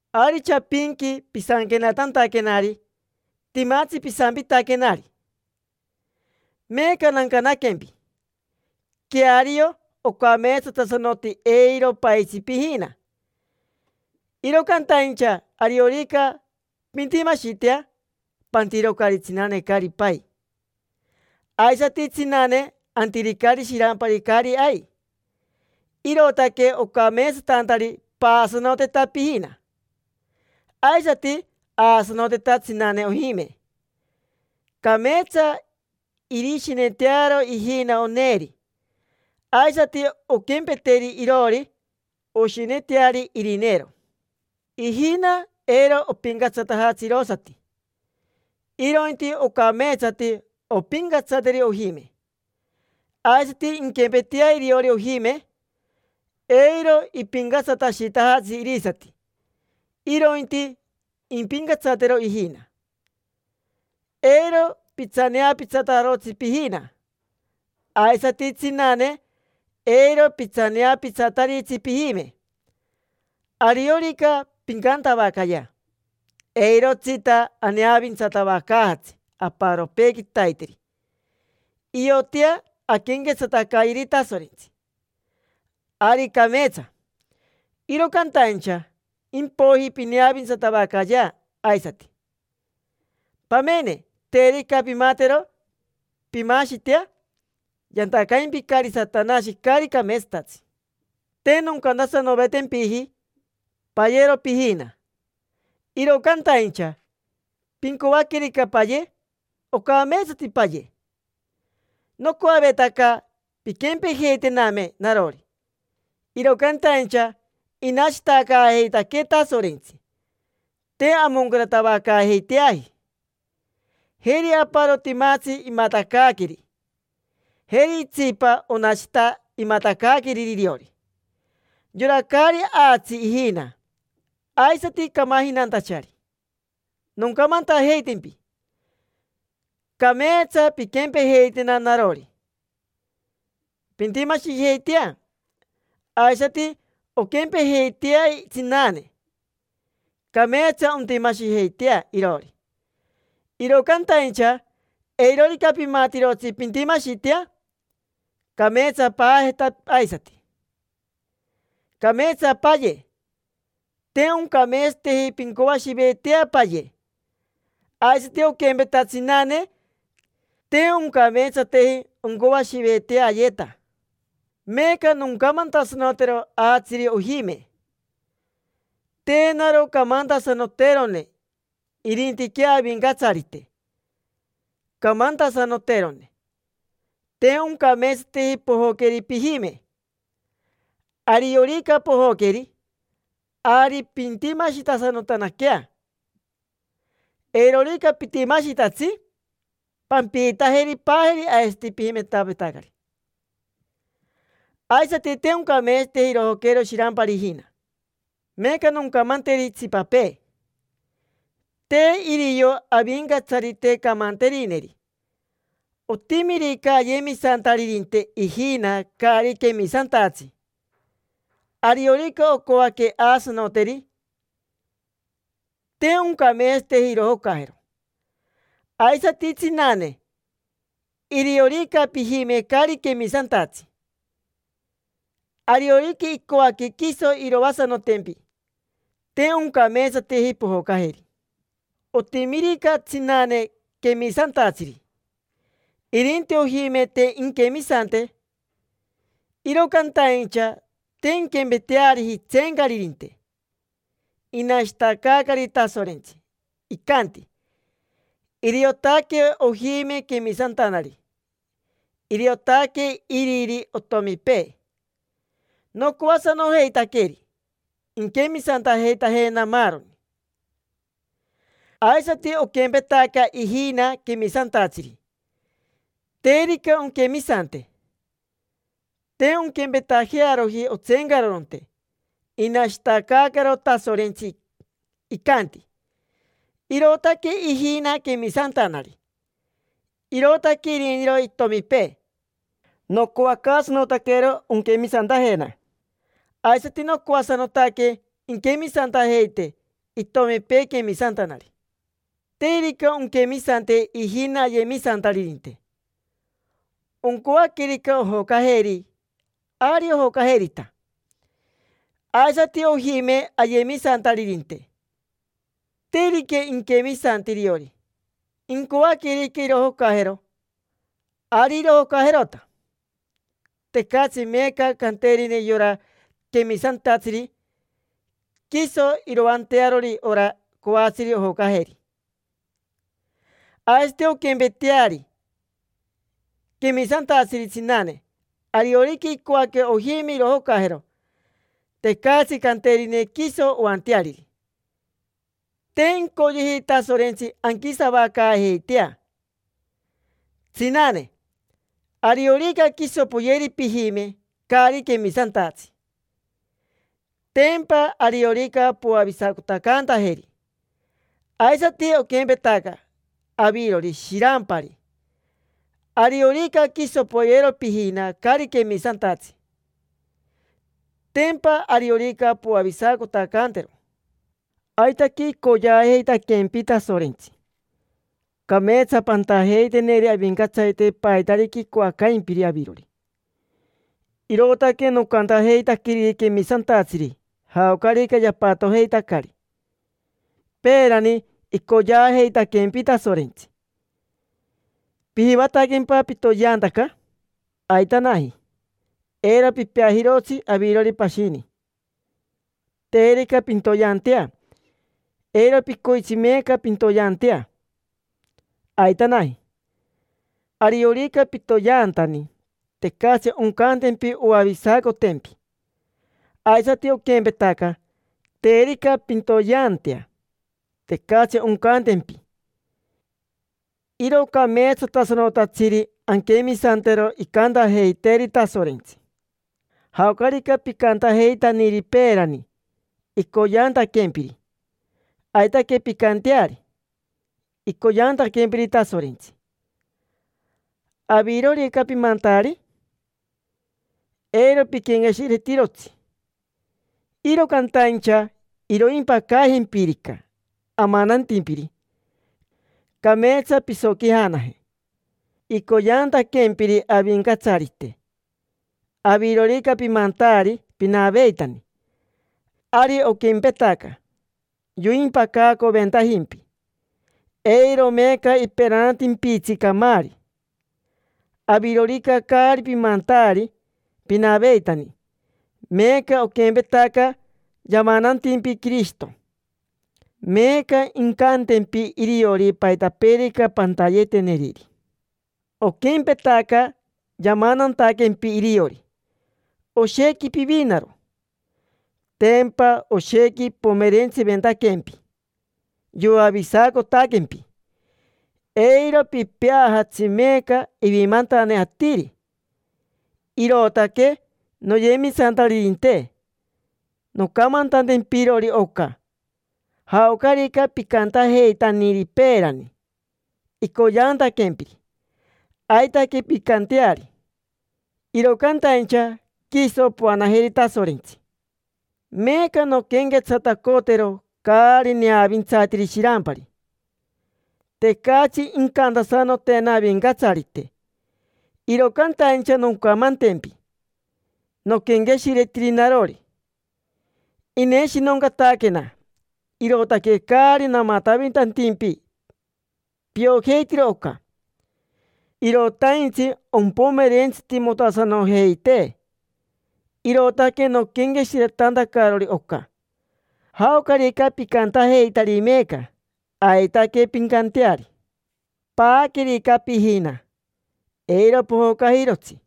Ari chapinqui pisanquenatantaquenari, timatsi pisampitaquenari. Meeca nancanaquempi. Queario ocameetsatasanoti eiro paitsi pijina. Iro cantaincha ariorica pintimashitea, pantirocari tsinane caari pai; aisati tsinane, antiricari shirampari caari ai. Irootaque ocameetsatantari paasanoteta pijina, aisati aasanoteta tsinane ojime. Cameetsa irishinetearo ijina oneeri, aisati onquempeteri iroori, oshineteari irineero. Ijina eiro opincatsatajatsi irosati, irointi ocameetsati ompincatsateri ojime. Aisati inquempetea iriori ojime, eiro ipincatsatashitajatsi irisati, irointi impincatsatero ijina. Eiro pitsaneapitsatarotsi pijina; aisati tsinane, eiro pitsaneapitsataritsi pijime. Ariorica pincantavacayea: “Eirotsita aneavintsatavacaajatsi aparopee quitaiteri; iotea anquenquetsatacayeri Tasorentsi”, ari cameetsa. Iro cantaincha impoiji pineavintsatavacayea aisati. Pamene, terica pimatero pimaashitea, yantacaimpicari Satanashi caari cameetsatatsi. Te noncantasanovetempiji: “Payero pijina”, iro cantaincha pincoaquerica paye, ocameetsati paye. Nocoavetaca pinquempejeitename narori, iro cantaincha inashitacaajeitaquee Tasorentsi, te amoncaratavacaajeiteaji. Jeri aparo, timatsi imatacaaqueri. Jeri itsipa, onashita imatacaaqueriri iriori. Yora caari aatsi ijina, aisati camajinantachari, noncamantajeitempi: cameetsa pinquempejeitena narori, pintimashijeitea. Aisati onquempejeitea tsinane, cameetsa ontimashijeitea iroori. Iro cantaincha eirorica pimatirotsi pintimashitea, cameetsa paajeta aisati. Cameetsa paye, te oncameetsateji pincoashiveetea paye. Aisati oquempeta tsinane, te oncameetsateji oncoashiveetea ayeta. Meeca noncamantasanotero aatsiri ojime. Te naro camantasanoterone, irintiquea Avincatsarite camantasanoterone: te oncameetsateji pojoqueri pijime. Ariorica pojoqueri, ari pintimashitasanotanaquea. Eirorica pitimashitatsi, pampiitajeri paajeri aisati pijimentavetacari. Aisati, te oncameetsateji irojocajero shirampari ijina. Meeca noncamanteri itsipapee, te irio Avincatsarite camanterineri: otimirica ayemisantaririnte ijina caari quemisantatsi, ariorica ocoaque aasanoteri, te oncameetsateji irojocajero. Aisati, tsinane, iriorica pijime caari quemisantatsi, ariorica icoaque quiso iroasanotempi, te oncameetsateji pojocajeri. Otimirica tsinane quemisantatsiri, irinti ojime te inquemisante. Iro cantaincha te inquempeteariji itseencaririnte; inashitacaari Tasorentsi, icanti: “Iriotaque ojime quemisantanari. Iriotaque iriri otomipee. Nocoacaasanojeitaqueri inquemisantajeitajena maaroni”. Aisati oquempetaca ijina quemisantatsiri, terica onquemisante. Te onquempetajearoji otseencaroronte; inashitacaacaro Tasorentsi, icanti: “Irootaque ijina quemisantanari. Irootaque iriniro itomipee. Nocoacaasanotaquero onquemisantajena, aisati nocoasanotaque inquemisantajeite itomipee quemisantanari”. Terica onquemisante ijina ayemisantaririnte, oncoaquerica ojocajeri, ari ojocajerita. Aisati ojime ayemisantaririnte, terica inquemisante iriori: incoaquerica irojocajero, ari irojocajerota. Tecatsi meeca canterine yora quemisantatsiri quiso iroantearori ora coatsiri ojocajeri. Aisati onquempeteari quemisantatsiri tsinane. Ariorica icoaque ojime irojocajero, tecatsi canterine quiso oanteariri. Te incoyeji Tasorentsi anquisavacaajeitea. Tsinane, ariorica quiso poyeri pijime caari quemisantatsi, tempa ariorica poavisacotacantajeri. Aisati oquempetaca avirori, shirampari: ariorica quiso poyero pijina caari quemisantatsi, tempa ariorica poavisacotacantero? Aitaque icoyeajeitaquempi Tasorentsi. Cameetsa pantajeiteneri Avincatsarite paitarica icoacaimpiri avirori. Irootaque nocantajeitaqueriri quemisantatsiri jaocarica yapatojeitacari. Peerani icoyeajeitaquempi Tasorentsi. ¿Pijivataquempa pitoyeantaca? Aitanaji, eiro pipeajirotsi. Avirori pashini, terica pintoyeantea, eiro picoitsi meeca pintoyeantea, aitanaji. Ariorica pitoyeantani, tecatsi oncantempi oavisacotempi. Aisati oquempetaca, terica pintoyeantea, tecatsi oncantempi. Iro cameetsatasanotatsiri anquemisantero icantajeiteeri Tasorentsi. Jaocarica picantajeitaniri peerani icoyeantaquempiri, aitaque pincanteari. Icoyeantaquempiri Tasorentsi, ¿avirorica pimantaari? Eiro piquenqueshiretirotsi. Iro cantaincha iroimpacajempirica amanantimpiri, cameetsa pisoquijanaje. Icoyeantaquempiri Avincatsarite, avirorica pimantaari pinaveitani, ari oquempetaca yoimpacacoventajimpi: eiro meeca iperanatimpitsi camaari. Avirorica caari pimantaari pinaveitani, meeca oquempetaca yamanantimpi Quirishito, meeca incantempi iriori paitapeerica pantayeteneriri. Oquempetaca yamanantaquempi iriori, oshequi pivinaro: tempa oshequi ipomerentsiventaquempi yoavisacotaquempi. Eiro pipeajatsi meeca ivimantane atiri. Irootaque, noyemisantaririnte, noncamantantempirori oca: jaocarica picantajeitaniri peerani icoyeantaquempiri, aitaque pincanteari; iro cantaincha, quiso poanajeri Tasorentsi. Meeca nonquenquetsatacotero caari neavintsatiri shirampari. Tecatsi incantasanotena Avincatsarite, iro cantaincha noncamantempi noquenqueshiretiri narori. Ineshinoncataquena, irootaque caari namatavitantimpi. Piojeitiro oca. Irotaintsi ompomerentsitimotasanojeitee, irootaque noquenqueshiretantacarori oca. Jaocarica picantajeitari meeca, aitaque pincanteari. Paaquerica pijina, eiro pojocajirotsi.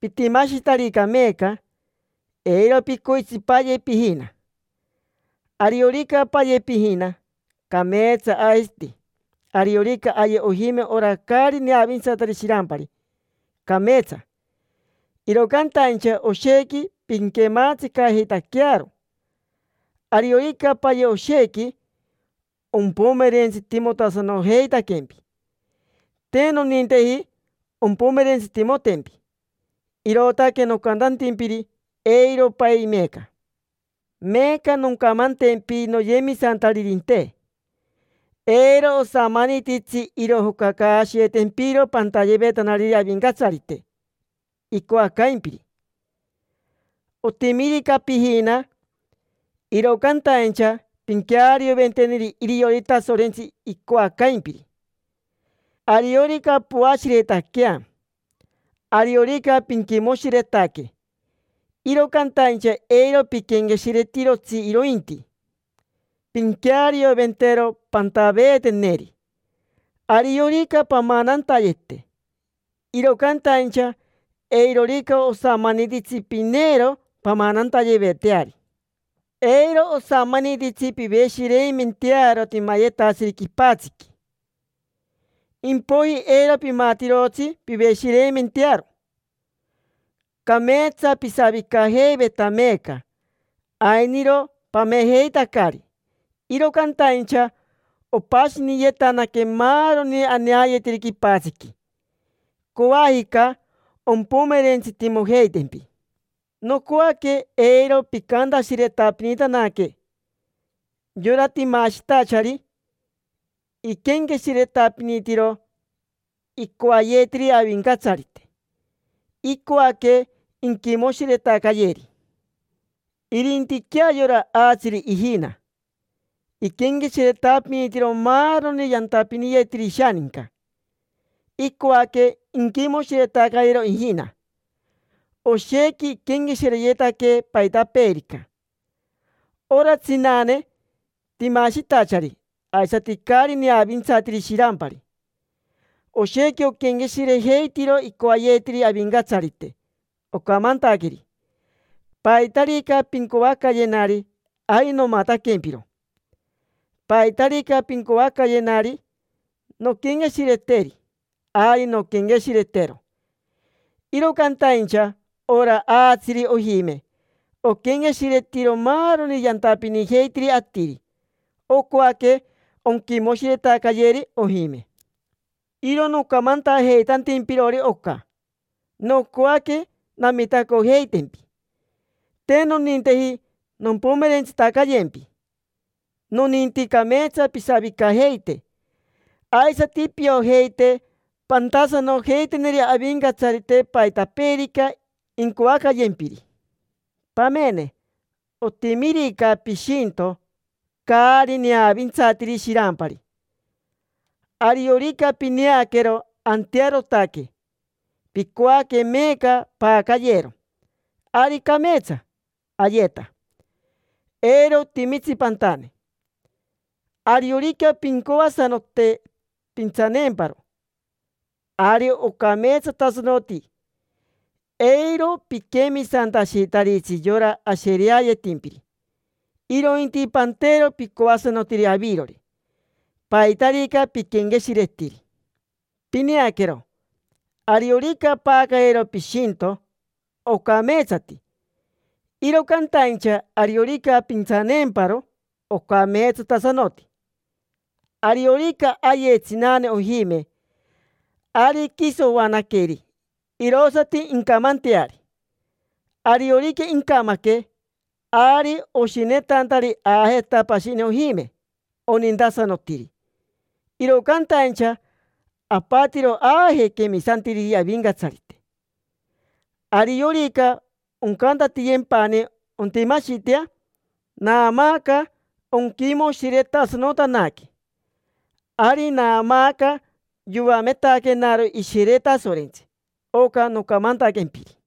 Pitimashitarica meeca, eiro picoitsi paye pijina. Ariorica paye pijina, cameetsa. Aisati ariorica aye ojime ora caari neavintsatiri shirampari, cameetsa; iro cantaincha oshequi pinquematsicajeitaquearo. Ariorica paye, oshequi ompomerentsitimotasanojeitaquempi. Te noninteji ompomerentsitimotempi, irootaque nocantantimpiri: “Eiro pai meeca”. Meeca noncamantempi, noyemisantaririnte: eiro osamanititsi irojocacaashiyeetempiro pantayevetanariri Avincatsarite icoacaimpiri. Otimirica pijina, iro cantaincha pinquearioventeneri iriori Tasorentsi icoacaimpiri. Ariorica poashiretaquea, ariorica pinquimoshiretaque; iro cantaincha eiro piquenqueshiretirotsi, irointi pinquearioventero pantaveeteneri. Ariorica pamanantayete, iro cantaincha eirorica osamanititsi pineero pamanantayeveteari. Eiro osamanititsi piveshireimentearo timayetatsiri quipatsiqui, impoiji eiro pimatirotsi piveshireimentearo. Cameetsa pisavicajeiveta meeca, ainiro pamejeitacari, iro cantaincha opashiniyetanaque maaroni aneayetiri quipatsiqui; coajica ompomerentsitimojeitempi. Nocoaque eiro picantashiretapinitanaque. Yora timashitachari, iquenqueshiretapinitiro icoayetiri Avincatsarite, icoaque inquimoshiretacayeri. Irintiquea yora aatsiri ijina, iquenqueshiretapinitiro maaroni yantapiniyetiri ishaninca: icoaque inquimoshiretacayero ijina, oshequi iquenqueshireyetaque paitapeerica. Ora tsinane timashitachari aisati caari neavintsatiri shirampari: oshequi oquenqueshirejeitiro icoayetiri Avincatsarite, ocamantaqueri: “Paitarica pincoacayenari, ari nomataquempiro. Paitarica pincoacayenari nonquenqueshireteri, ari nonquenqueshiretero”. Iro cantaincha ora aatsiri ojime oquenqueshiretiro maaroni yantapinijeitiri atiri, ocoaque onquimoshiretacayeri ojime. Iro nocamantajeitantimpirori oca, nocoaque namitacojeitempi, te noninteji nompomerentsitacayempi. Noninti cameetsa pisavicajeite, aisati piojeite pantasanojeiteneri Avincatsarite paitapeerica incoacayempiri. Pamene, otimirica pishinto caari neavintsatiri shirampari. Ariorica pineaquero antearotaque, picoaque meeca paacayero; ari cameetsa. Ayeta, eiro otimitsi pantane. Ariorica pincoasanote pintsaneemparo, ari ocameetsatasanoti, eiro piquemisantashitaritsi yora ashereayetimpiri, irointi pantero picoasanotiri avirori, paitarica piquenqueshiretiri. Pineaquero, ariorica paacayero pishinto, ocameetsati; iro cantaincha ariorica pintsaneemparo, ocameetsatasanoti. Ariorica aye tsinane ojime, ari quiso oanaqueri, irosati incamanteari. Ariorica incamaque, ari oshinetantari aajeta pashini ojime onintasanotiri. Iro cantaincha apatiro aaje quemisantiriri Avincatsarite. Ariorica oncantatiyempani ontimashitea, naamaaca onquimoshiretasanotanaque. Ari naamaaca yoametaquenaro Ishire Tasorentsi oca nocamantaquempiri.